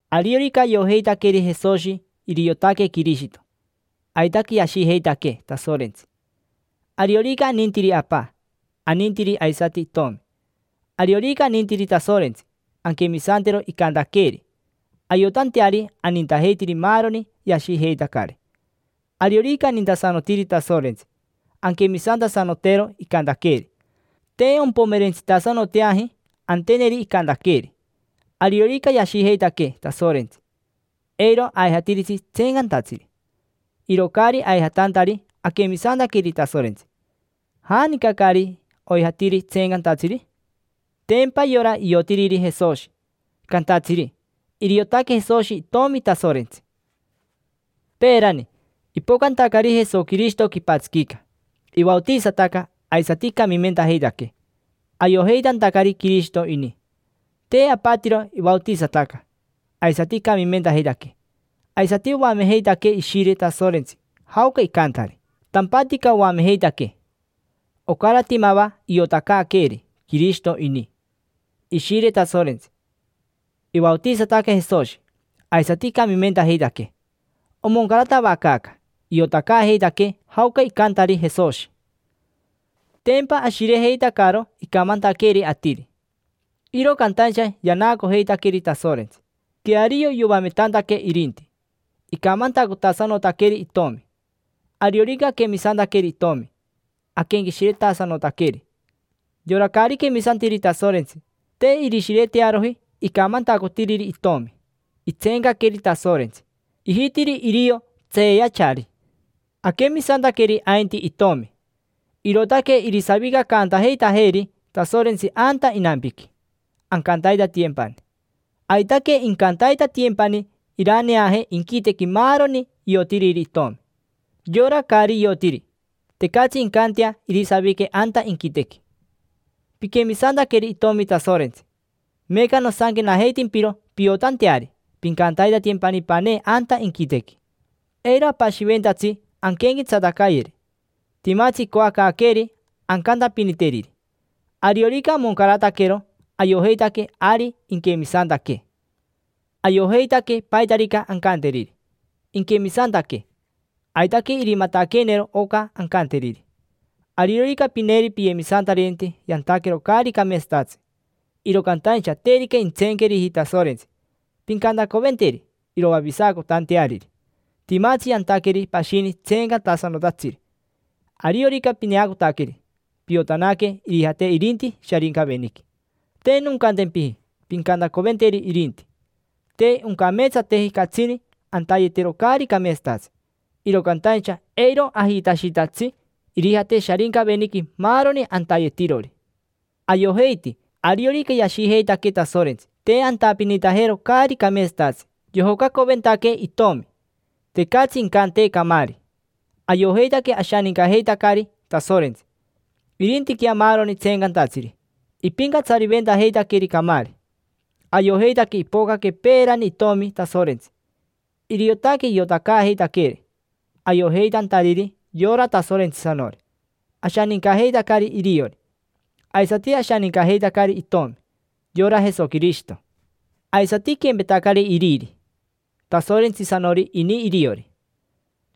Ariorica ayojeitaqueri Jesoshi iriotaque Quirishito, aitaque yashijeitaquee Tasorentsi. Ariorica anintiri Apa, anintiri aisati Itomi. Ariorica anintiri Tasorentsi, anquemisantero icantaqueeri, ayotanteari anintajeitiri maaroni yashijeitacari. Ariorica anintasanotiri Tasorentsi, anquemisantasanotero icantaqueeri. Te ompomerentsitasanoteaji anteneri icantaqueeri. Ariorica yashijeitaquee Tasorentsi, eiro aijatiritsi tseencantatsiri. Iro caari aijatantari, aquemisantaqueri Tasorentsi. ¿Janica caari oijatiri tseencantatsiri? Tempa yora iotiriri Jesoshi, cantatsiri: “Iriotaque Jesoshi Itomi Tasorentsi”. Peerani, ipocantacari Jesoquirishito quipatsiquica, ivaotisataca aisati icamimentajeitaquee, ayojeitantacari Quirishito ini. Te apatiro ivaotisataca, aisati icamimentajeitaquee. Aisati oamejeitaquee Ishire Tasorentsi jaoca icantari. Tampatica oamejeitaquee. Ocarati mava iotacaaqueeri Quirishito ini: Ishire Tasorentsi, ivaotisataca Jesoshi, aisati icamimentajeitaquee. Omoncaratavacaaca, iotacaajeitaquee jaoca icantari Jesoshi. Tempa ashirejeitacaro icamantaqueeri atiri, iro cantaincha yanacojeitaqueri Tasorentsi, queario yoametantaque irinti. Icamantacotasanotaqueri itomi. Ariorica aquemisantaqueri Itomi, aquenqueshiretasanotaqueri. Yora caari quemisantiri Tasorentsi, te irishiretearoji icamantacotiriri Itomi: itseencaqueri Tasorentsi, ijitiri irio tseeyachari. Aquemisantaqueri ainti Itomi, irootaque irisavicacantajeitajeeri Tasorentsi anta inampiqui, ancantaitatiyempani. Aitaque incantaitatiyempani iraneaje inquitequi maaroni iotiriri Itomi. Yorari caari iotiri, tecatsi incantea irisavique anta inquitequi. Piquemisantaqueri Itomi Tasorentsi, meeca nosanquenajeitimpiro piotanteari pincantaitatiyempani panee anta inquitequi. Eiro apashiventatsi anquenquetsatacayeri: timatsi icoacaaqueeri ancantapiniteriri. Ariorica amoncarataquero ayojeitaque ari inquemisantaquee. Ayojeitaque paitarica ancanteriri, inquemisantaquee. Aitaque irimataqueenero oca ancanteriri. Ariorica pineeri piyemisantaririnte yantaquero caari cameetsatatsi, iro cantaincha terica intseenqueriji Tasorentsi, pincantacoventeri iroavisacotanteariri. Timatsi yantaqueri pashini tseencantasanotatsiri: ariorica pineacotaqueri, piotanaque irijate irinti Sharincaveniqui. Te noncantempiji pincantacoventeri irinti. Te oncameetsateji catsini antayetero caari cameetsatatsi, iro cantaincha eiro ajitashitatsi irijate Sharincaveniqui maaroni antayetirori. Ayojeiti ariorica yashijeitaquee Tasorentsi, te antapinintajeroji caari cameetsatatsi. Yojocacoventaquee Itomi, tecatsi incantee camaari. Ayojeitaque ashanincajeitacari Tasorentsi. Irintiquea maaroni tseencantatsiri, ipincatsariventajeitaqueri camaari. Ayojeitaque ipocaque peerani Itomi Tasorentsi, iriotaque iotacaajeitaqueeri, ayojeitantariri yora Tasorentsisanori. Ashanincajeitacari iriori, aisati ashanincajeitacari Itomi, yora Jesoquirishito. Aisati iquempetacari iriri, Tasorentsisanori ini iriori.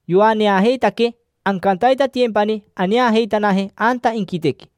Yoaneajeitaquee, ancantaitatiyempani aneajeitanaje anta inquitequi.